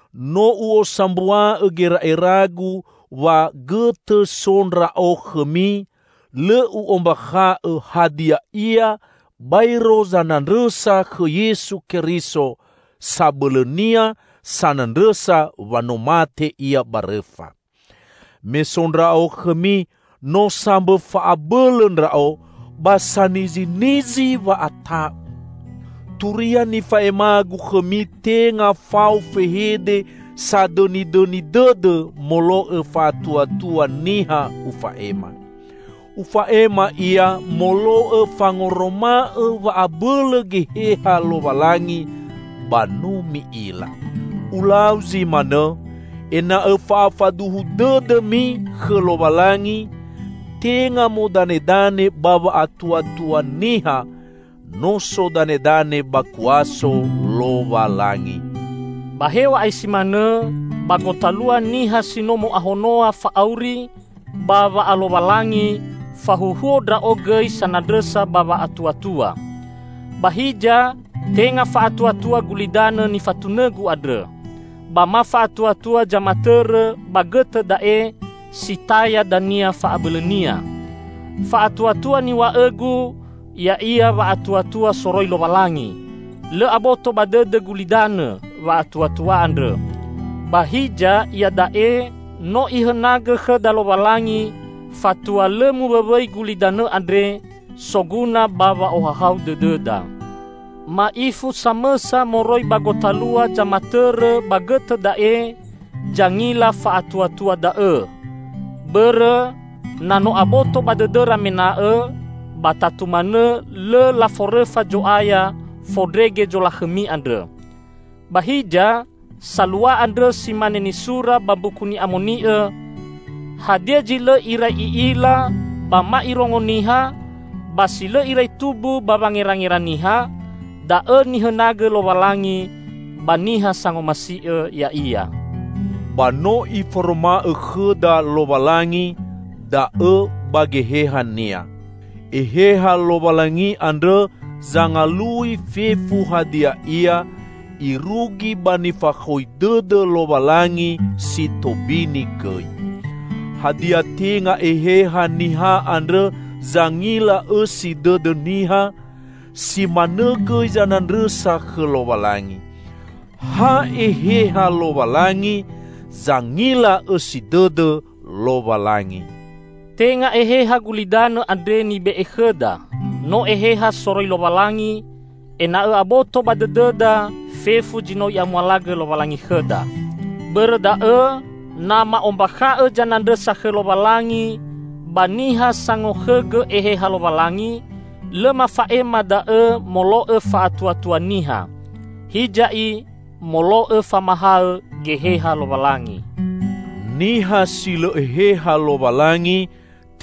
No u'osambua'õ gera'eragu wa gõtõ so ndra'o khõmi, lõ u'ombakha'õ hadia ia baero zanandrõsa khõ Yesu Keriso; sabõlõnia sanandrõsa wa no mate Ia ba rõfa. Me so ndra'o khõmi no sambõ fa'abõlõ ndra'o ba sanizinizi wa'ata'u. Turia nifa'emagu khõmi tenga fao fehede sadõnidõni dõdõ molo'õ fa'atuatua niha ufa'ema. Ufa'ema ia molo'õ fangoroma'õ wa'abõlõ Geheha Lowalangi, ba no mi'ila. Ulau zi manõ, ena'õ fa'afaduhu dõdõmi khõ Lowalangi tenga modanedane ba wa'atuatua niha, no sodanedane ba kuaso Lowalangi. Ba hew̃a'ae si manõ, ba gotalua niha si no mo'ahonoa fa'auri ba wa'alowalangi, fahuhuo ndra'o gõi sanandrõsa ba wa'atuatua. Ba hiza tenga fa'atuatua gulidanõ nifatunõgu andrõ, ba ma fa'atuatua zamatõrõ ba gõtõ da'e si taya dania fa'abõlõnia. Fa'atuatua niw̃a'õgu ya'ia wa'atuatua soroi Lowalangi. Lõ aboto ba dõdõ gulidanõ wa'atuatua andrõ, ba hiza iada'e no Ihõnagõ khõda Lowalangi, fatua lõ muwõwõi gulidanõ andre, soguna ba wa'ohahau dõdõda. Ma'ifu samõsa moroi ba gotalua zamatõrõ ba gõtõ da'e zangila fa'atuatua da'õ. Bõrõ, na no aboto ba dõdõra mena'õ, ba tatu manõ lõ laforõfa Zo'aya fondrege zolakhõmi andrõ. Ba hiza, salua andrõ si mane nisura ba Mbuku Ni'amoni'õ, "Hadia zi lõ irai i'ila ba ma irongo niha, ba si lõ irai tumbu ba wangerangera niha, da'õ nihõnagõ Lowalangi ba niha sangomasi'õ Ya'ia." Ba no Iforoma'õ khõda Lowalangi da'õ ba Geheha-Nia. Eheha Lowalangi andrõ zangalui fefu hadia ia, irugi ba nifakhoi dõdõ Lowalangi si tobini gõi. Hadia tenga eheha niha andrõ zangila õsi dõdõ niha? Si manõ gõi zanandrõsa khõ Lowalangi. Ha Eheha Lowalangi zangila õsi dõdõ Lowalangi! Tenga eheha gulidanõ andre nibe'e khõda, no Eheha soroi Lowalangi, ena'õ aboto ba dõdõda fefu zi no I'amualagõ Lowalangi khõda. Bõrõ da'õ, na ma'ombakha'õ zanandrõsa khõ Lowalangi ba niha sangokhõgõ Eheha Lowalangi, lõ mafa'ema da'õ molo'õ fa'atuatua niha, hiza i molo'õ famahaõ Geheha Lowalangi. Niha si lõ Eheha Lowalangi,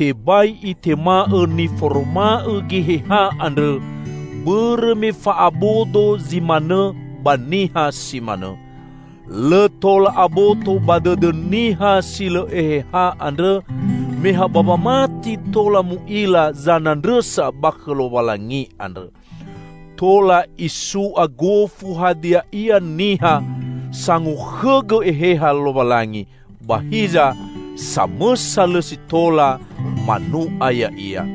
tebai itema'õ niforoma'õ Geheha andrõ, bõrõ me fa'abodo zi manõ ba niha si manõ. Lõ tola aboto ba dõdõ niha si lõ Eheha andrõ, me ha ba wamati tola mu'ila zanandrõsa ba khõ Lowalangi andrõ. Tola isu'a gofu hadia ia niha sangokhõgõ Eheha Lowalangi, ba hiza, samõsa lõ si tola manu'a ya'ia.